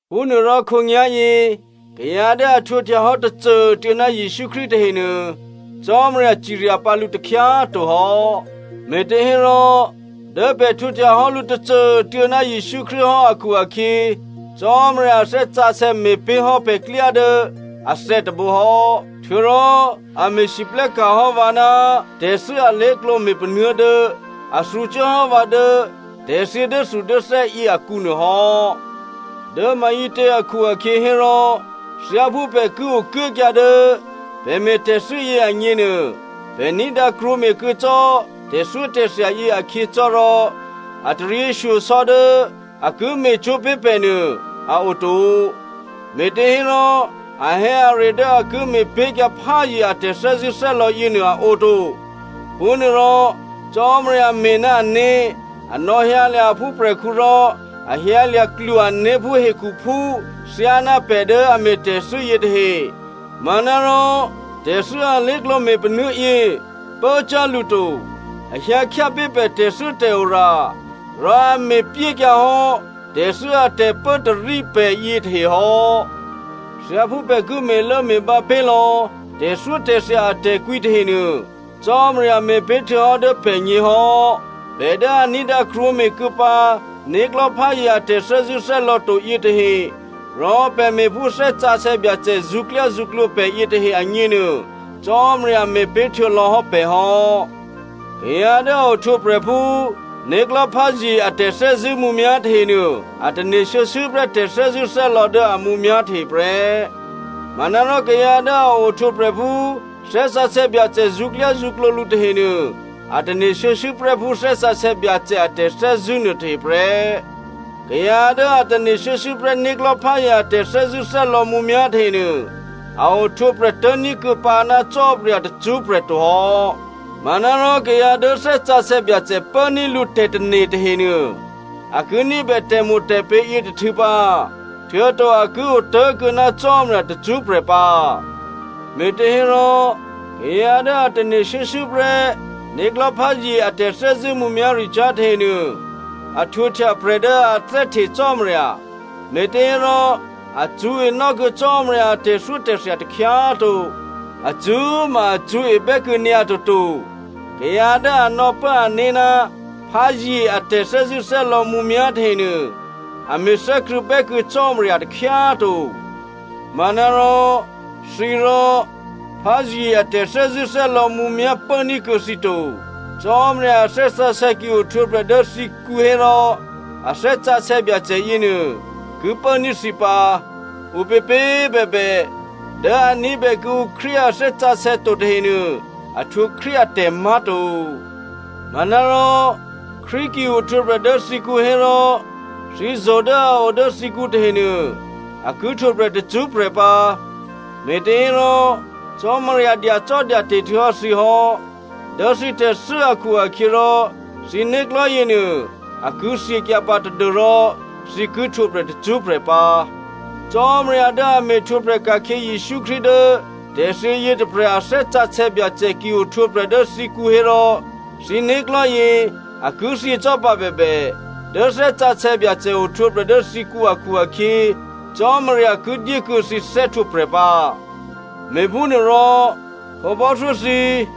Phúnuôrò khǒnyá̤yě, kayǎ dố a htwǒhtyahò́ tôcô꤮ tuô̌ ná Jesǔ Krístu tahenuô, Cò́marya cirya pǎ lǔ takhyá꤮ to hò́. Mé̤těhérò dố pè̤ htwǒhtya hò́ lǔ tôcô꤮ tuô̌ ná Jesǔ Krístu hò́ akhu-akhyě, Cò́marya a Thè́ Sǎsè̌ me̤pé̤hò́ pè̤klyá dố athè̌ tôbǒ hò́. Htuô̌rò a me̤lwóhteka̤ hò́ vǎ ná tè̤thû́ alé̤klǒ me̤panuố̤ dố a thǔcuốhò́ vǎ dố tè̤thyě dốthudốthè́ yě akǔ nuôhò́. Dố maǐtě akhu-akhyě hérò, thyáphú pè̤ ki okuốkyǎ dố pè̤ me̤ tè̤thû́ yě agněnuô, pè̤ ní̤dǎ krwǒme̤kuô̌ cò́ tè̤thyótè̤thya yě akhyě cò́ rò, a taryěshyosò̌ dố a ki me̤cwó̤ pé̤ pè̤nuô a oto, me̤těhérò ahè̌are dố a ki me̤pé̤kyǎ pházye a tè̤thè́zṳ̂́thè́lò̌ yěnuô a oto. Phúnuôrò Cò́marya me̤ ná ané̤, a nò̌hyǎlya̤ a phúprè̤khǔ rò a hyǎlya̤ klwo-ané̤ phú hekhuphú thyáná pè̤ dố a me̤ tè̤thû́ yětahe. Manárò tè̤thû́ alé̤klǒ me̤panuố̤ yě pốcyá̤ lǔ to. A hyǎ khyápé̤ pè̤ tè̤thû́tè̤ora, rò a me̤pyékyǎ hò́ tè̤thû́ a tè̤pốtarí pè̤ yětahe hò́. Thyáphú pè̤ ki me̤lốme̤bǎ pé̤lò̌ tè̤thyótè̤thya atè̤kwǐ tahenuô, Cò́marya me̤pé̤htuô̌hò́ dố pè̤gně hò́. Pè̤ dố a ní̤dǎ krwǒme̤ kuô̌ pǎ né̤klò̤́pházye a tè̤thè́zṳ̂́thè́lò̌ to yětahe, rò pè̤ me̤ phú Thè́ Sǎsè̌ Byacè zṳ̌klyázṳ̌klǒ pè̤ yětahe agněnuô, Cò́marya me̤ pé̤htuô̌ lò̌hò́ pè̤ hò́. Kayǎ dố a ohtwǒprè̤ phú né̤klò̤́pházye a tè̤thè́zṳ̂́ mǔmyá̤ tahenuô, a tane̤ shuô̌shuô̌ prè́ tè̤thè́zṳ̂́thè́lò̌ dố a mǔmyá̤ tahe prè́. Manárò kayǎ dố a ohtwǒprè̤ phú Thè́ Sǎsè̌ Byacè zṳ̌klyázṳ̌klǒ lǔ tahenuô, a tane̤ shuô̌shuô̌prè́ phú Thè́ Sǎsè̌ Byacè a tè̤thè́zṳ̂́ nuôtahe prè́. Kayǎ dố a tane̤ shuô̌shuô̌prè́ né̤klò̤́pházye a tè̤thè́zṳ̂́thè́lò̌ mǔmyá̤ tahenuô, a ohtwǒprè̤ tố̤ní̤kuô̌ pǎ ná Cò́marya tacṳ́prè̤ to hò́. Manárò kayǎ dố Thè́ Sǎsè̌ Byacè pốní̤ lǔ tè̤tane̤ tahenuô, a ki ní̤bè tè̤mo̤tè̤pě̤ yětôhtû̌ pǎ, htuô̌to a ki otố̤kuô̌ ná Cò́marya tacṳ́prè̤ pǎ. Me̤těhérò, kayǎ dố a tane̤ shuô̌shuô̌prè́ né̤klò̤́pházye a tè̤thè́zṳ̂́ mǔmyá̤ricyá̤ tahenuô, a htwǒhtya prè̤ dố a thè́hte Cò́marya. Me̤těhérò a cṳ̌e nò́kuô̌ Cò́marya a tè̤thyótè̤thya takhyá꤮ to. A cṳ̌꤮ ma a cṳ̌e bè́kuô̌ nyǎ toto. Kayǎ dố a nò̌pố ané̤ ná pházye a tè̤thè́zṳ̂́thè́lò̌ mǔmyá̤ tahenuô, a me̤thè́krṳ̂̌ bè́kuô̌ Cò́marya takhyá꤮ to. Manárò, thǐrò, pházye a tè̤thè́zṳ̂́thè́lò̌ mǔmyá̤ pốní̤kuô̌ thǐ to. Cò́marya a Thè́ Sǎsè̌ ki ohtwǒprè̤ dố thǐkǔ hérò, a Thè́ Sǎsè̌ Byacè yěnuô ki pốní̤ thǐ pǎ. Ǔpěpě꤮ bèbè, dố a ní̤bè kuô̌ǔ Krístu a Thè́ Sǎsè̌ to tahenuô a htwǒ Krístu atè̤ má̤to. Manárò Krístu ki ohtwǒprè̤ dố thǐkǔ hérò, thǐ zo̤ dố a o dố thǐkǔ tahenuô a ki htwǒprè̤ tacṳ́prè̤ pǎ, me̤těhérò Cò́marya dyacò́dyate̤ htuô̌hò́ thǐ hò́. Dố thǐ tè̤thû́ akhu-akhyěrò thǐ né̤klò̤́ yěnuô, a ki thyěkyǎ pǎ tadû́rò thǐ ki htwǒprè̤ tacṳ́prè̤ pǎ. Cò́marya dố a me̤htwǒprè̤ ka̤khyě Jesǔ Krístu dố tè̤thyě yětôprè̤ a Thè́ Sǎsè̌ Byacè ki ohtwǒprè̤ dố thǐkǔ hérò, thǐ né̤klò̤́yě a ki thyě cò́ pǎ bèbè, dố Thè́ Sǎsè̌ Byacè ohtwǒprè̤ dố thǐkǔ akhu-akhyě, Cò́marya ki dyékuô̌ thǐ thè́htwǒprè̤ pǎ. Me̤phúnuôrò khǒbò́thyó thǐ꤮,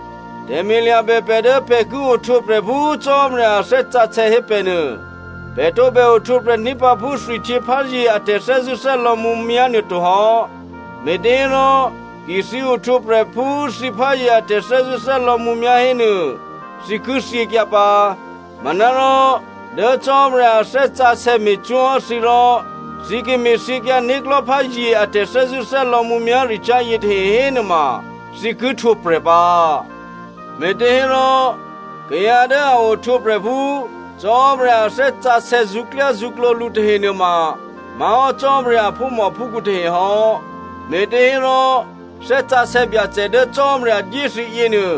tè̤me̤ lya̤bè pè̤ dố pè̤ ki ohtwǒprè̤ phú Cò́marya a Thè́ Sǎsè̌ hé pè̤ nuô. Pè̤ tǒbè ohtwǒprè̤ ní̤ pǎ phú thwihtyěpházye a tè̤thè́zṳ̂́thè́lò̌ mǔmyá̤ nuôtohò́. Me̤těhérò, ki thǐ ohtwǒprè̤ phú thǐ pházye a tè̤thè́zṳ̂́thè́lò̌ mǔmyá̤ hénuô, thǐ ki thyěkyǎ pǎ. Manárò dố Cò́marya a Thè́ Sǎsè̌ me̤cwó̤ hò́ thǐ rò thǐ ki me̤thyěkyǎ né̤klò̤́pházye a tè̤thè́zṳ̂́thè́lò̌ mǔmyá̤ricyá̤ yětahe hénuôma, thǐ ki htwǒprè̤ pǎ. Me̤těhérò, kayǎ dố a ohtwǒprè̤ phú Cò́marya a Thè́ Sǎsè̌ zṳ̌klyázṳ̌klǒ lǔ tahe nuôma má̤hò́ Cò́marya a phúmòphúkhǔ tahe hò́. Me̤těhérò Thè́ Sǎsè̌ Byacè dố Cò́marya dyé thǐ yěnuô,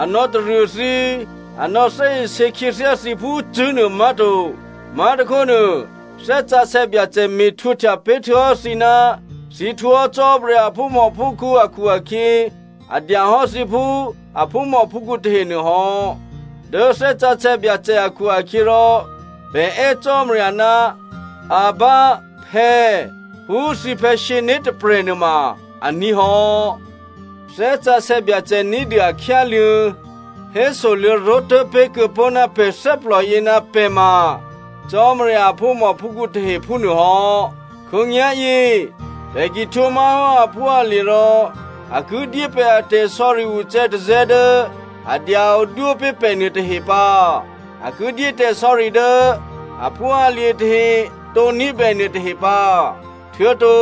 a nò̌taruô thǐ, a nò̌thè́isě khyěthyá thǐ phú cṳ̂́nuô má̤to. Má̤tôkhónuô, Thè́ Sǎsè̌ Byacè me̤htwǒhtya pé̤htuô̌hò́ thǐ ná thǐ htwǒhò́ Cò́marya a phúmòphúkhǔ akhu-akhyě, a dya hò́ thǐ phú a phúmòphúkhǔ tahenuô hò́. Dố Thè́ Sǎsè̌ Byacè akhu-akhyěrò, pè̤ è́ Cò́marya, “Abba, Phè̌” phú thǐphè̌ sǐné̤ tôprè̤ nuôma aní̤ hò́. Thè́ Sǎsè̌ Byacè ní̤dû a khyáluô̌, hésoluô̌ ró̤tố̤ pé̤kuô̌pó̤ ná pè̤ thè́plò yě ná pè̤ ma Cò́marya a phúmòphúkhǔ tahe, phúnuôhò́. Khǒnyá̤yě pè̤ ki htwǒ má̤hò́ aphúalye̤ rò a ki dyé pè̤ a tè̤sò̌ri ucè̌tazè̌ dố a dya odwó pé̤ pè̤ nuôtahe pǎ. A ki dyé tè̤sò̌ri dố aphúalye̤ tahe tǒ ní̤bè nuôtahe pǎ. Htuô̌to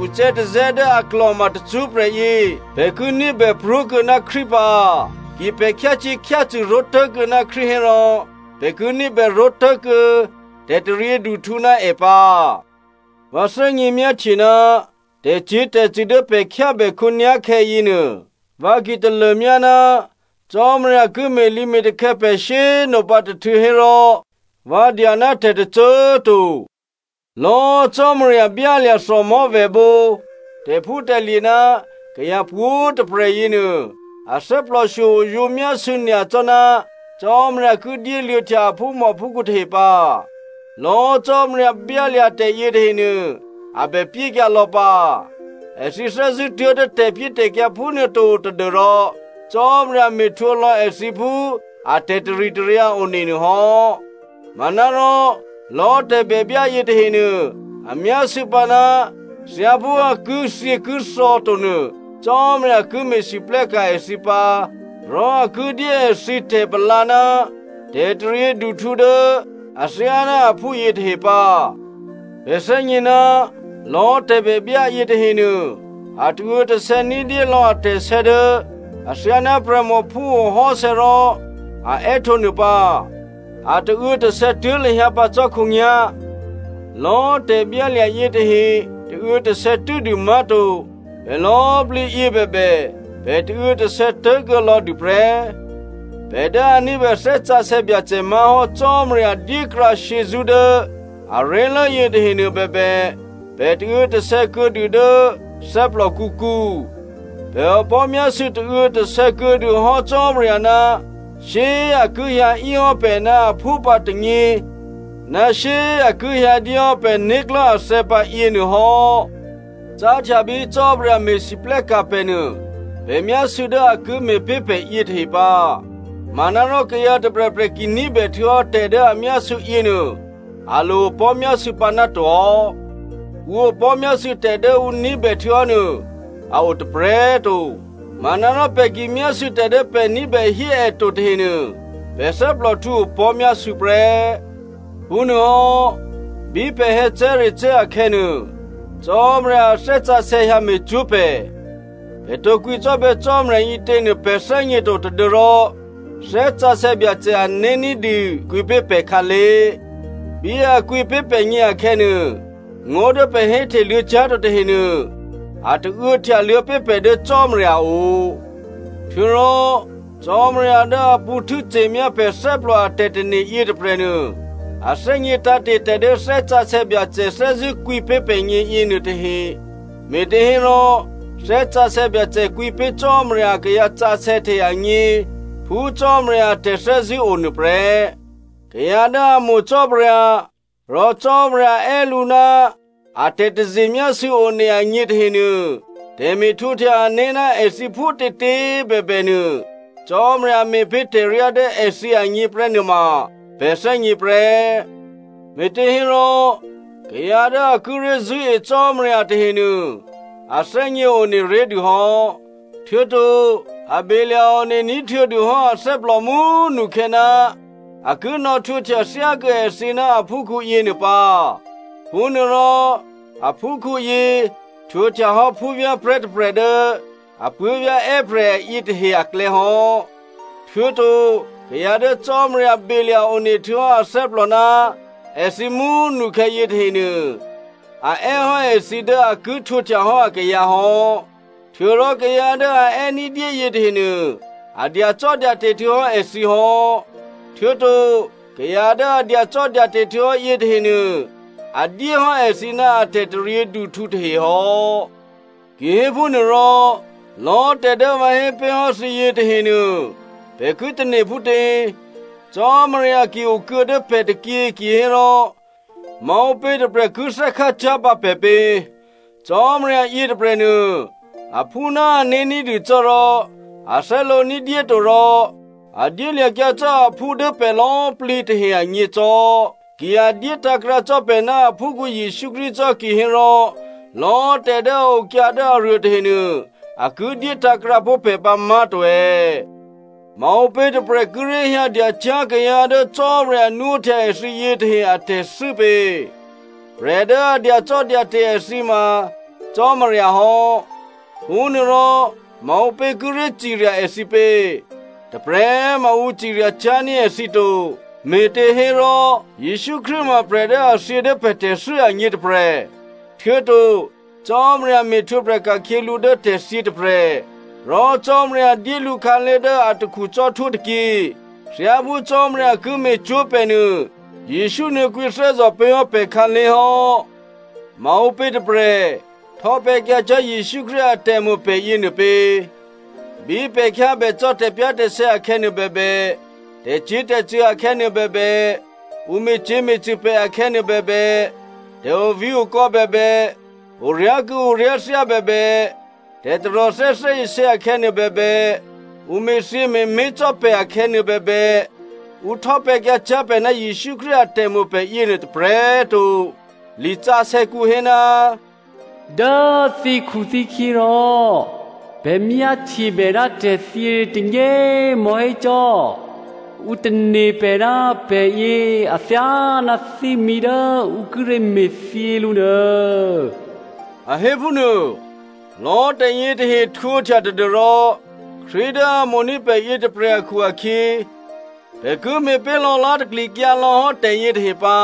ucè̌tazè̌ dố a klò̤ma tacṳ́prè̤ yě pè̤ ki ní̤bè pró̤kuô̌ ná Krístu pǎ. Ki pè̤ khyácyě̤khyácṳ̂ ró̤tố̤kuô̌ ná Krístu hérò pè̤ ki ní̤bè ró̤tố̤kuô̌ tè̤taryěduhtǔ ná è pǎ. Vǎ thè́gně myáhtye ná tè̤cyě̤tè̤cṳ̂ dố pè̤ khyábè khǒnyá̤khè̌ yěnuô, vǎ ki talômyá ná Cò́marya ki me̤lǐme̤takhè̌ pè̤ shyé꤮ nopǎ tôhtû̌ hérò, vǎ dya ná tè̤tôcô꤮ to. Lò̌꤮ Cò́marya byálya̤ thòmò̤́vèbǒ, tè̤phútè̤lye̤ ná kayǎ pwǒ̤꤮ tôprè̤ yěnuô, a thè́plò shyo oyǒ myásû̌ nyacò́ ná Cò́marya ki dyéluô̌htya a phúmòphúkhǔ tahe pǎ. Lò̌꤮ Cò́marya byálya̤ tè̤ yětahenuô a bè pyékyǎ lò̌ pǎ. Èthǐ thè́zṳ̂́ tuố̤dố tè̤pyétè̤kyǎ phúnuô to tadû́rò Cò́marya me̤htwǒlò̌ èthǐ phú atè̤ taritaryǎ one nuôhò́. Manárò lò̌ tè̤bèbyá yětahenuô a myásû̌ pǎná, thyáphú a kithyěkithò̌ to nuô, Cò́marya ki me̤lwóhteka̤ èthǐ pǎ rò a ki dyé èthǐ tè̤palǎ ná tè̤taryěduhtǔ dố athyáná aphú yětahe pǎ. Pè̤ thè́gně ná lò̌ tè̤bèbyá yětahenuô, a tauô̌tasè̌ ní̤dyé lò̌ atè̤sè̌ dố athyáná prè̤mò phúo hò́sè̌ rò a è́htǒ nuô pǎ. A tauô̌tasè̌ tuố̤ lahyǎ pǎ cò́ khǒnyá̤. Lò̌꤮ tè̤byálya̤ yětahe tauô̌tasè̌ tû́dû má̤to, pè̤ lò̌꤮ plǐyě bèbè, pè̤ tauô̌tasè̌ tố̤kuô̌ lò̌ dûprè́. Pè̤ dố a ní̤bè Thè́ Sǎsè̌ Byacè má̤hò́ Cò́marya dyékrǎ shyězṳ́ dố aré̤lố yětahenuô bèbè, pè̤ tauô̌tasè̌ kuô̌dû dố thè́plòkǔkǔ. Pè̤ opò̤́myásû̌ tauô̌tasè̌ kuô̌dûhò́ Cò́marya ná shyé꤮ a ki hyǎ íhò́ pè̤ ná aphú pǎ tônyě, ná shyé꤮ a ki hyǎdyéhò́ pè̤ né̤klò̤́ athè̌ pǎ yěnuôhò́. Cáhtya bí Cò́marya me̤lwóhteka̤ pè̤ nuô, pè̤ myásû̌ dố a ki me̤pé̤ pè̤ yětahe pǎ. Manárò kayǎ tôprè̤prè̤ ki ní̤bè htuô̌hò́ tè̤ dố a myásû̌ yěnuô, a lo opò̤́myásû̌ pǎ ná to hò́. Ǔ opò̤́myásû̌ tè̤ dố ǔ ní̤bè htuô̌hò́nuô a o tôprè̤꤮ to. Manárò pè̤ ki myásû̌ tè̤ dố pè̤ ní̤bèhí è to tahenuô, pè̤ thè́plòhtǔ opò̤́myásû̌ prè́. Phúnuôhò́, bí pè̤ hè̌cè̤́recè̤́ akhè̌nuô, Cò́marya a Thè́ Sǎsè̌ hyǎ me̤cwó̤ pè̤. Pè̤ tǒ kwǐcò́bè̌ Cò́marya ǐtěnuô pè̤ thè́gněto tadû́rò Thè́ Sǎsè̌ Byacè ané̤ ní̤dû kwǐpé̤ pè̤khǎlé̤. Bí a kwǐpé̤ pè̤gně akhè̌nuô, ngó̤ dố pè̤ hé hteluô̌ cyá̤to tahenuô a tauô̌ htyaluô̌ pé̤ pè̤ dố Cò́marya o. Htuô̌rò Cò́marya dố a pṳ̌ htû́ce̤myá pè̤ thè́plò a tè̤tane̤ yětôprè̤nuô, a thè́gně tǎ̤te̤ tè̤ dố Thè́ Sǎsè̌ Byacè thè́zṳ̂́ kwǐpé̤ pè̤gně yěnuôtahe, me̤těhérò Thè́ Sǎsè̌ Byacè kwǐpé̤ Cò́marya akayǎ sǎsè̌ tahe agně phú Cò́marya a tè̤thè́zṳ̂́o nuôprè́. Kayǎ dố a mo̤ Cò́marya, rò Cò́marya è́ lǔ ná a tè̤taze myásû̌ one agně tahenuô, tè̤me̤htwǒhtya ané̤ ná èthǐ phútětě꤮ bèbènuô, Cò́marya me̤ pé̤ tè̤ryá dố èthǐ agněprè́ nuôma, pè̤ thè́gně prè́. Me̤těhérò, kayǎ dố a kíré̤ zṳ̂́e Cò́marya tahenuô a thè́gně one ré̤dûhò́. Htuô̌to a belya̤-one ní̤htuô̌dûhò́ athè́plò mú꤮ nukhè̌ ná a ki nò̌htwǒhtya thyákuô̌ èthǐ ná aphúkhǔ yěnuô pǎ. Phúnuôrò aphúkhǔyě htwǒhtyahò́ phúvyá̤prè̤́ tôprè̤ dố apuố̤vyá̤ è́prè̤ yětahe aklè̌ hò́. Htuô̌to, kayǎ dố Cò́marya belya̤ one htuô̌hò́ athè́plò ná èthǐ mú꤮ nukhè̌ yětahenuô, a è́hò́ èthǐ dố a ki htwǒhtyahò́ akayǎ hò́. Htuô̌rò kayǎ dố a è́ ní̤dyé yětahenuô, a dyacò́dyate̤ htuô̌hò́ èthǐ hò́. Htuô̌to kayǎ dố a dyacò́dyate̤ htuô̌hò́ yětahenuô, a dyéhò́ èthǐ ná a tè̤taryěduhtǔ tahe hò́. Kihéphúnuôrò, lò̌꤮ tè̤dố vǎ hé pé̤hò́ thǐ yětahenuô, pè̤ ki tane̤ phútě? Cò́marya ki okuô̌ dố pè̤ tôkyě kihérò, maǔpě tôprè̤ ki thè́khácyá̤pǎ pè̤ pě? Cò́marya yětôprè̤nuô, aphú ná ané̤ ní̤dû cò́ rò a thè́lǒ ní̤dyé to rò a dyélya̤kyǎ cò́ aphú dố pè̤ lò̌꤮ plǐ tahe agně cò́. Ki a dyétǎ̤krǎ cò́ pè̤ ná aphúkhǔ Jesǔ Krístu cò́ kihérò, lò̌꤮ tè̤ dố a okyǎ dố aruô tahenuô, a ki dyé tǎ̤krǎpó̤ pè̤ pǎ má̤to è̌? Maǔpě tôprè̤ kíré̤ hyǎ dyacyá̤ kayǎ dố Cò́marya nwóhtya èthǐ yětahe atè̤thû́ pě? Prè̤ dố a dyacò́dyate̤ èthǐ ma Cò́marya hò́. Phúnuôrò, maǔpě kíré̤ cirya èthǐ pě? Tôprè̤꤮ ma ǔ cirya cyá̤ní̤ èthǐ to. Me̤těhérò, Jesǔ Krístu ma prè̤ dố a thyě dố pè̤ tè̤thû́ agně tôprè̤, htuô̌to Cò́marya me̤htwǒprè̤ ka̤khyě lǔ dố tè̤thyě tôprè̤. Rò Cò́marya dyé lǔ khǎlé̤ dố atakhu cò́htwó tôkyě. Thyáphú Cò́marya ki me̤cwó̤ pè̤ nuô Jesǔ nuô̌ kwǐthè́zò̤ pé̤ hò́ pè̤ khǎlé̤ hò́. Maǔpě tôprè̤ htò́pè̤̌kyǎcyá̤ Jesǔ Krístu atè̤mo̤ pè̤ yěnuô pě? Bí pè̤ khyábè cò́ tè̤pyá̤tè̤sè̌ akhè̌nuô bèbè, tè̤cyě̤tè̤cṳ̂ akhè̌ nuôbèbè, ǔ me̤cyě̤me̤cṳ̂ pè̤ akhè̌nuô bèbè, tè̤ovǐ̤okò̌ bèbè, oryá̤kû̌ oryá̤thyá bèbè, tè̤taròthè́ thè́isě akhè̌nuô bèbè, ǔ me̤thyě me̤mé̤ cò́ pè̤ akhè̌ nuôbèbè, ǔ htò́pè̤̌kyǎcyá̤ pè̤ ná Jesǔ Krístu atè̤mo̤ pè̤ yěnuô tôprè̤꤮ to. Lisǎsè̌kǔ hé, “Dố thǐkhuthǐkhyě rò, pè̤ myáhtyebè ná tè̤thyě tônyě꤮ mò̤́hé cò́. Ǔ tane̤ pè̤ ná pè̤yě athyáná thímí dố ǔ kíré̤ me̤thyě lǔ nuô,” a hé phúnuô. Lò̌꤮ tè̤yětahe htwǒhtya tadû́rò Krístu dố a mo̤ní̤ pè̤ yětôprè̤ akhu-akhyě, pè̤ ki me̤pé̤ lò̌lá̤taklikyǎ lò̌hò́ tè̤yětahe pǎ.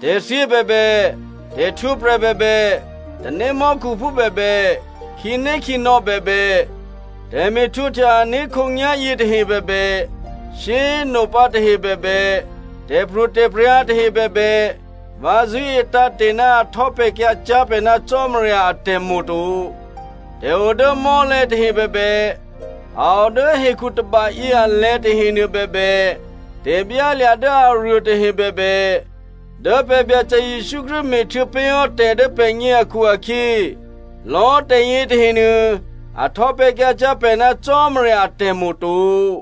Tè̤thyě bèbè, tè̤htwǒprè̤ bèbè, tanémò́khuphú bèbè, khǐnékhǐnò̌ bèbè, tè̤me̤htwǒhtya ané̤ khǒnyá̤yě tahe bèbè, shyé꤮ nopǎ tahe bèbè, tè̤pro̤tè̤prya̤ tahe bèbè, vǎ zṳ̂́e tǎ̤te̤ ná a htò́pè̤̌kyǎcyá̤ pè̤ ná Cò́marya atè̤mo̤ to. Tè̤ o dố mò́lè̤̌ tahe bèbè, a o dố hekhu tôbayě alè̤̌ tahenuô bèbè, tè̤byálya̤ dố aruô tahe bèbè, dố pè̤ Byacè Jesǔ Krístu me̤htuô̌ pé̤hò́ tè̤ dố pè̤gně akhu-akhyě, lò̌꤮ tè̤ yětahenuô a htò́pè̤̌kyǎcyá̤ pè̤ ná Cò́marya atè̤mo̤ to.